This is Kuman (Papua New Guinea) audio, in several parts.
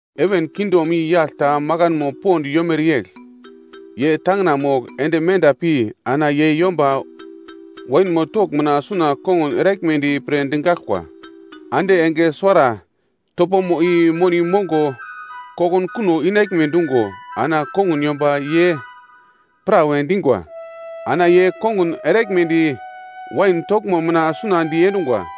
“Heven kingdom i yagl ta makanmo pond yomere yegl. Ye tangina mogl ende menda pi ana ye yomba wainmo togl mina suna kongun eraglmedi pre digaglkwa. Ande enge suwara topomo i moni mongo kokunkuno inaglme dungo ana kongun yomba ye prawe dingwa. Ana ye kongun eraglmedi wainmo togl mina suna diendungwa.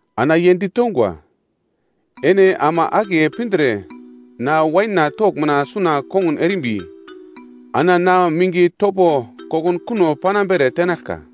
Ana ye ditongwa, ‘Ene ama akiye pindre na wainna togl mina suna kongun erimbi, ana na minge topo kokunkuno panambere tenaglka.’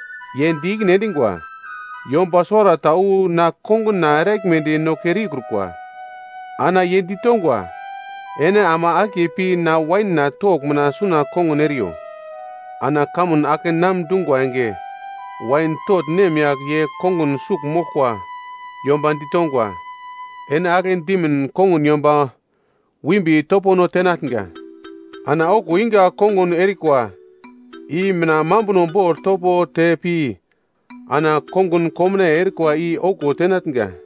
“Ye di ikine endingwa, ‘Yomba suwarata wu na konguna eraglmedi no kere ikrukwa.’ “Ana ye ditongwa, ‘Ene ama akiye pi na wainna togl mina suna kongun eriyo.’ “Ana kamun akenam dungwa enge wain togl nemyagl ye kongun sugl moglkwa yomba ditongwa, ‘Ene agle dimin kongun yomba wimbi topono tenatnga, ana okuwo inga kongun erikwa i mina mambuno bogl topo te pi, ana kongun komnaiye erikwa i okuwo tenatnga.’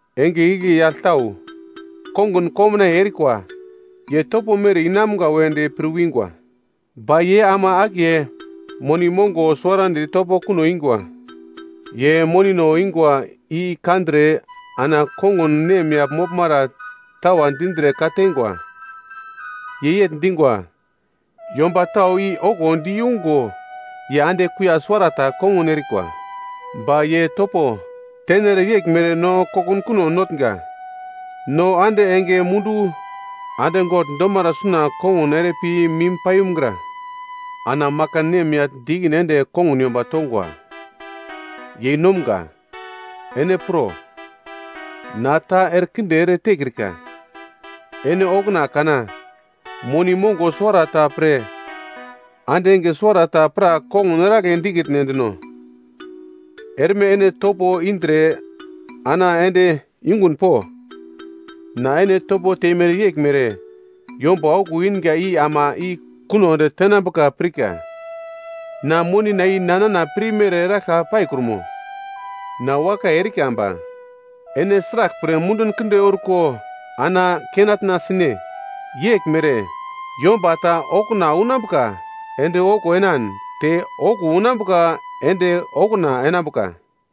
Enge igle yagl tau kongun komnaiye erikwa, ye topo mere inamga wedi pir wingwa. Ba ye ama akiye moni mongo suwarandi topo kuno ingwa. Ye monino ingwa i kandre ana kongun nemyagl moglmara tawa dindre ka-tengwa. Ye yegl dingwa, ‘Yomba tau i okuwo di yungo ye ande kuiya suwarata kongun erikwa. Ba ye topo tenere yeglmere no kokunkuno notnga. No ande enge mundu ande gogl domara suna kongun ere pi mim paiyumgra.’ “Ana makan nemyagl di ikine ende kongun yomba tongwa, ‘Yeinomga ene pro, na ta erekinde ere tekrika. Ene okuna kana moni mongo suwarata pre ande enge suwarata pra kongun eragle dikitne dino? Erme ene topo indre ana ende yungun po. Na ene topo teimere yeglmere yomba okuwo inga i ama i kuno ende tenambuka pirka. Na monina i nana pirmere eraglka paikrumo? Na wakai erika ba ene sraglpre mundun kinde orko ana kenatna sine?’ “Yeglmere, yomba ta okuna unambuka ende okuwo enan, te okuwo unambuka ende okuna enambuka.”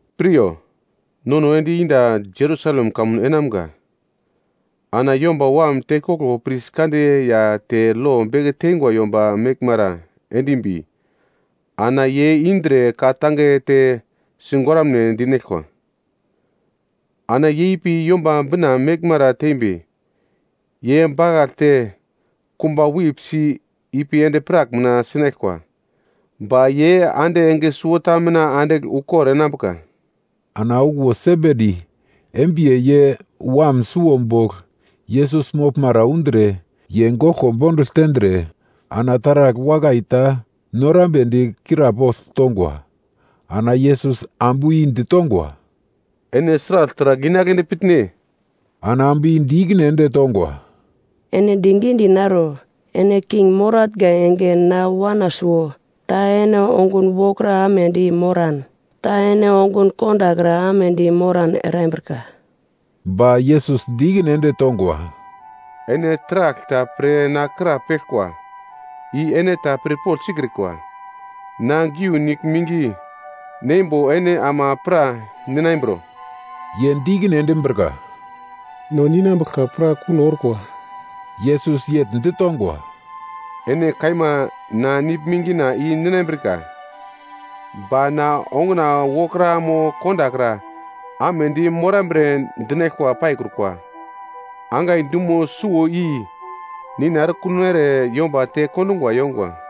“Piryo, nono ende yenda Jerusalem kamun enamga. Ana Yomba Wam tekoglo pris kande ya te lo beke teingwa yomba meglmara endimbi, ana ye indre ka-tange te sigoraglme dinaglkwa. Ana ye ipi Yomba Bina meglmara tembi, ye bakaglte, kumba wip si ipi endi-prak mina sinaglkwa. Ba ye ande enge suwota mina andigl ukor enambuka!” Ana okuwo Sebedi embiye ye wam suwo bogl Yesus moglmara undre ye goglko bondugl tendre, ana taragl wakai ta norambedi krapogl tongwa. Ana Yesus ambu i ditongwa, “Ene sragl taragl inagledi pitne?” Ana ambu i di ikine ende tongwa, “Ene digidi naro, ene king moratnga enge na wana suwo, ta ene ongun wokra amedi moran, ta ene ongun kondakra amedi moran erambrika.” Ba Yesus di ikine ende tongwa, “Ene taragl ta pre na krapeglkwa, i ene ta pirpogl sikrikwa. Na geu nigl mingi neimbo ene ama pra ninambro?” Ye di ikine endimbrika, “No ninambuglka pra kuno orkwa.” Yesus yegl ditongwa, “Ene kaima na nigl mingina i ninambrika. Ba na onguna wokra mo kondakra amedi morambre dinaglka paikrukwa. Angai dumo suwo i Nina erekuno ere yomba tekondungwa yongwa.”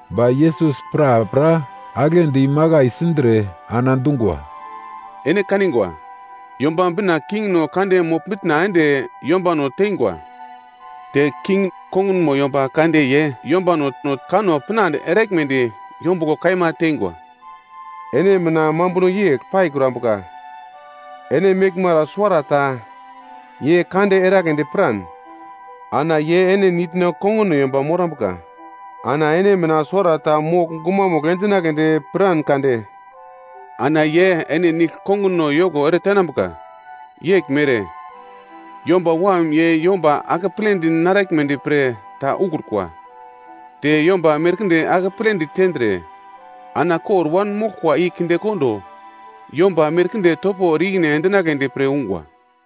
Ba Yesus prapra aglendi makai sindre ana dungwa, “Ene kanigwa, Yomba Bina kingno kande mogl-mitna ende yombano teingwa. Te king kongunmo yomba kande ye yombano no kanno pinande eraglmedi yombuglo kaima teingwa. Ene mina mambuno yegl paikrambuka. Ene meglmara suwarata ye kande eragledi piran, ana ye ene nitno konguno yomba morambuka. Ana ene mina suwarata mogl gumamugl endinagledi piran kade, ana ye ene nigl konguno yoko eretenambuka. Yeglmere, Yomba Wam ye yomba akepledi naraglmedi pre ta ukrukwa. Ye yomba merkinde akepledi tendre, ana kor wanmoglkwa i kindekondo yomba merkinde topo ere i-ikine endinagledi pre ungwa.”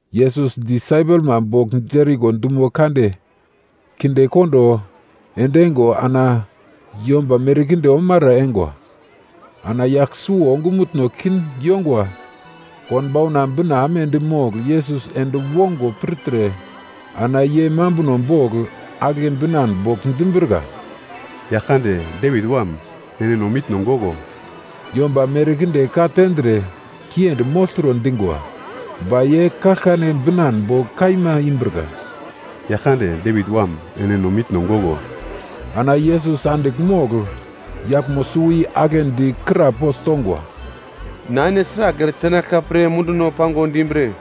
Yesus disaipelma bogl Jeriko dumo kande kindekondo endeingo ana yomba merkinde omara eingwa. Ana yagl suwo ongumutno kin yongwa konbauna bina amedi mogl Yesus ende wongo pirtre, ana ye mambuno bogl agle binan bogl dimbrika, “Yaglkande, Devit Wam! Ene no mitno goglo.” Yomba merkinde ka tendre kiendi mogltro dingwa, ba ye kaglkane binan bogl kaima imbrika, “Yaglkande, Devit Wam, ene no mitno goglo!” Ana Yesus andigl mogl yaglmo suwo i aglendi krapogl tongwa, “Na ene sragl eretenaglka pre munduno pango dimbre?”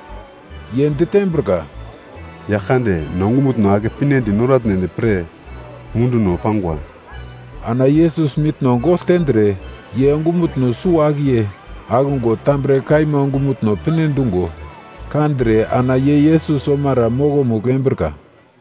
Ye ditembrika, “Yaglkande, no ongumutno ake pinedi noratnedi pre munduno pangwa.” Ana Yesus mitno gogl tendre, ye ongumutno suwo-akiye akungo tambre kaima ongumutno pinedungo kandre, ana ye Yesus omara mokomugl embrika.